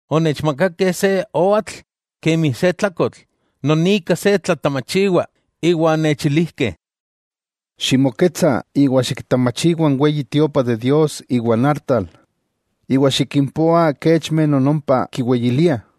Onechmakakeh se oatl kemi se tlakotl non ika se tlatamachiwa, iwa onechilijkeh: —Ximoketsa iwa xiktamachiwa n Weyi Tiopa de Dios iwa n artal, iwa xikimpoa kechmeh non ompa kiweyiliah.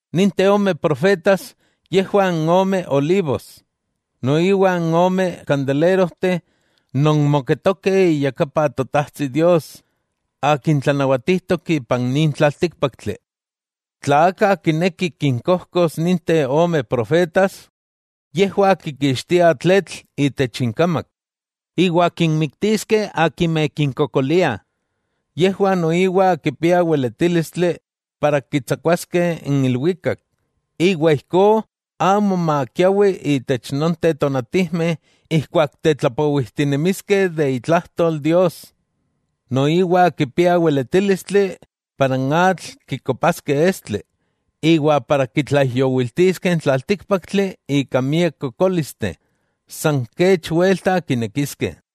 Ninteh ome profetas yejwah n ome olivos noiwa n ome kandelerojteh non moketokeh iyakapan Totajtsi Dios Akin tlanawatijtok ipan nin tlaltíkpaktli. Tla aka kineki kinkojkos ninteh ome profetas, yejwah kikixtiah tletl itech inkamak, iwa kinmiktiskeh akimeh kinkokoliah. Yejwah noiwa kipiah weletílistli ken kitsakuaskeh n ilwikak, iwa ijkó amo makiawi itech nonteh tonatijmeh ijkuak tetlapowijtinemiskeh itlajtol Dios. Noiwa kipiah weletílistli kenomi n atl kikopaskeh estli, iwa kenomi kitlaijyowiltiskeh n tlaltíkpaktli ika miak kokólisteh, san kech welta kinekiskeh.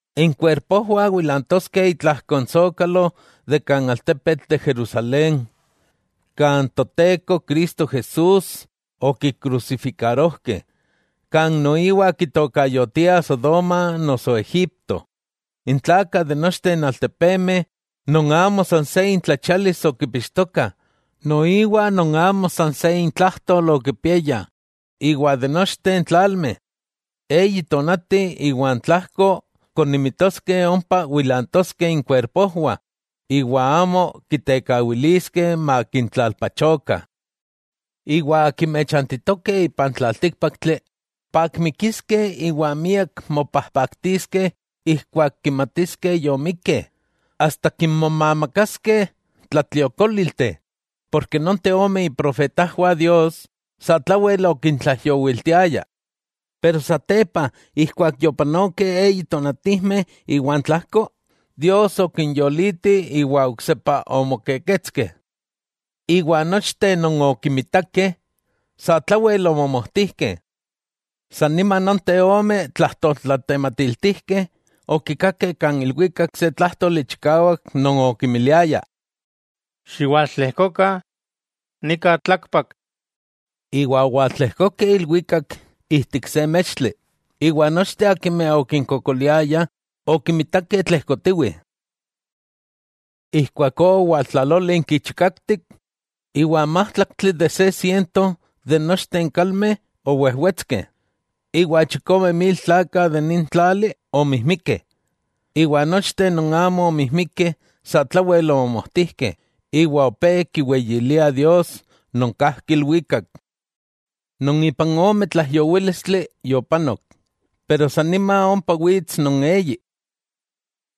Inkuerpojwah wilantoskeh itlajko n sókalo kan altepetl de Jerusalén kan Toteko Cristo Jesús okikrusifikarojkeh, kan noiwa kitokayotiah Sodoma noso Egipto. N tlakah itech nochteh n altepemeh, non amo san se intlachialis okipixtokah, noiwa non amo san se intlajtol okipiaya itech nochteh n tlalmeh, eyi tónati iwa n tlajko konimitoskeh ompa wilantoskeh inkuerpojwah iwa amo kitekawiliskeh makintlalpachokah. Iwa akimeh chantitokeh ipan tlaltíkpaktli, pakmikiskeh iwa miak mopajpaktiskeh ijkuak kimatiskeh yomikkeh, asta kinmomamakaskeh tlatliokólilteh, porke nonteh ome iprofetajwah Dios, satlawel okintlaijyowiltiayah. Satepa ijkuak yopanokeh eyi tonatijmeh iwa n tlajko, Dios okinyoliti iwa oksepa omokeketskeh, iwa nochteh non okimitakeh, satlawel omomojtijkeh. San nima nonteh ome tlajtoltlatematiltijkeh okikakeh kan ilwikak se tlájtoli chikawak non okimiliaya: —¡Xiwaltlejkokah nika tlakpak! Iwa owaltlejkokeh ilwikak ijtik se mextli, iwa nochteh akimeh okinkokoliayah okimitakeh tlejkotiwih. Ijkuakó owaltlalólinki chikaktik, iwa n májtlaktli itech se siento de nochteh n kalmeh owejwetskeh, iwa chikome mil tlakah de nin tlali omijmikeh. Iwa nochteh non amo omijmikeh satlawel omomojtijkeh, iwa opé kiweyiliah Dios non kajki ilwikak. Non ipan ome tlaijyowílistli yopanok, iwa san nima ompa wits non eyi.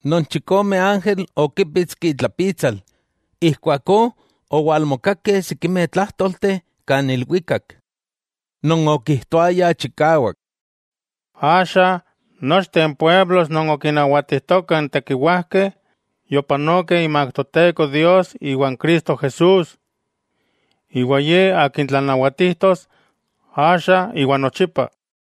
Non chikome ángel okípitski itlapitsal, ijkuakó owalmokakeh sikimeh tlájtolteh kan ilwikak, non okijtoayah chikawak: Axa nochteh n altepetlakameh non okinnawatijtokah n tekiwajkeh, yopanokeh imak Toteko Dios iwa Cristo Jesús; iwa Ye Akin tlanawatijtos axa iwa nochipa.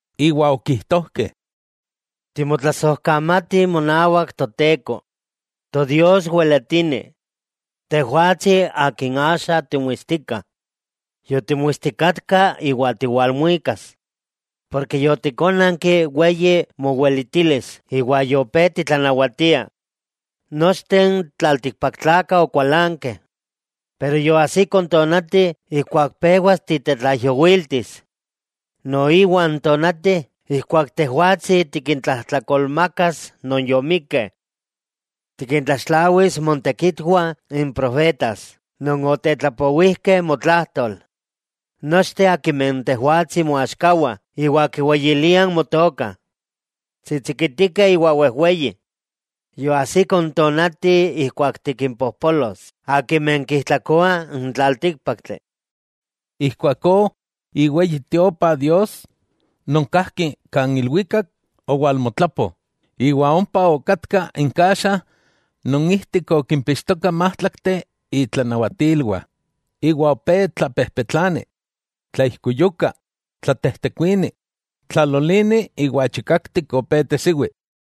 Iwa okijtojkeh: Timotlasojkamatih monawak Toteko, Todios weletini, tejwatsi Akin axa timuistika, yotimuistikatka iwa tiwalmuikas, ken yotikonanki weyi moweletilis iwa yopé titlanawatia. Nochteh n tlaltikpaktlakah okualankeh. Iwa yoajsiko n tonati ijkuak pewas titetlaijyowiltis, noiwa n tonati ijkuak Tejwatsi tikintlajtlakolmakas non yomikkeh. Tikintlaxtlawis motekitwah n profetas non okitetlapowijkeh motlajtol. Nochteh akimeh Tejwatsi moaxkawah iwa kiweyiliah Motoka, tsitsikitikeh iwa wejweyi, yoajsiko n tonati ijkuak tikimpojpolos akimeh kijtlakoah n tlaltíkpaktli. Ijkuakó iweyi Tiopa Dios non kajki kan ilwikak, owalmotlapo, iwa ompa okatka n kaxa non ijtik okimpixtoka n májtlakteh itlanawatilwah. Iwa opé tlapejpetlani, tlaijkuyuka, tlatejtekuini, tlalolini iwa chikaktik opé tesiwi.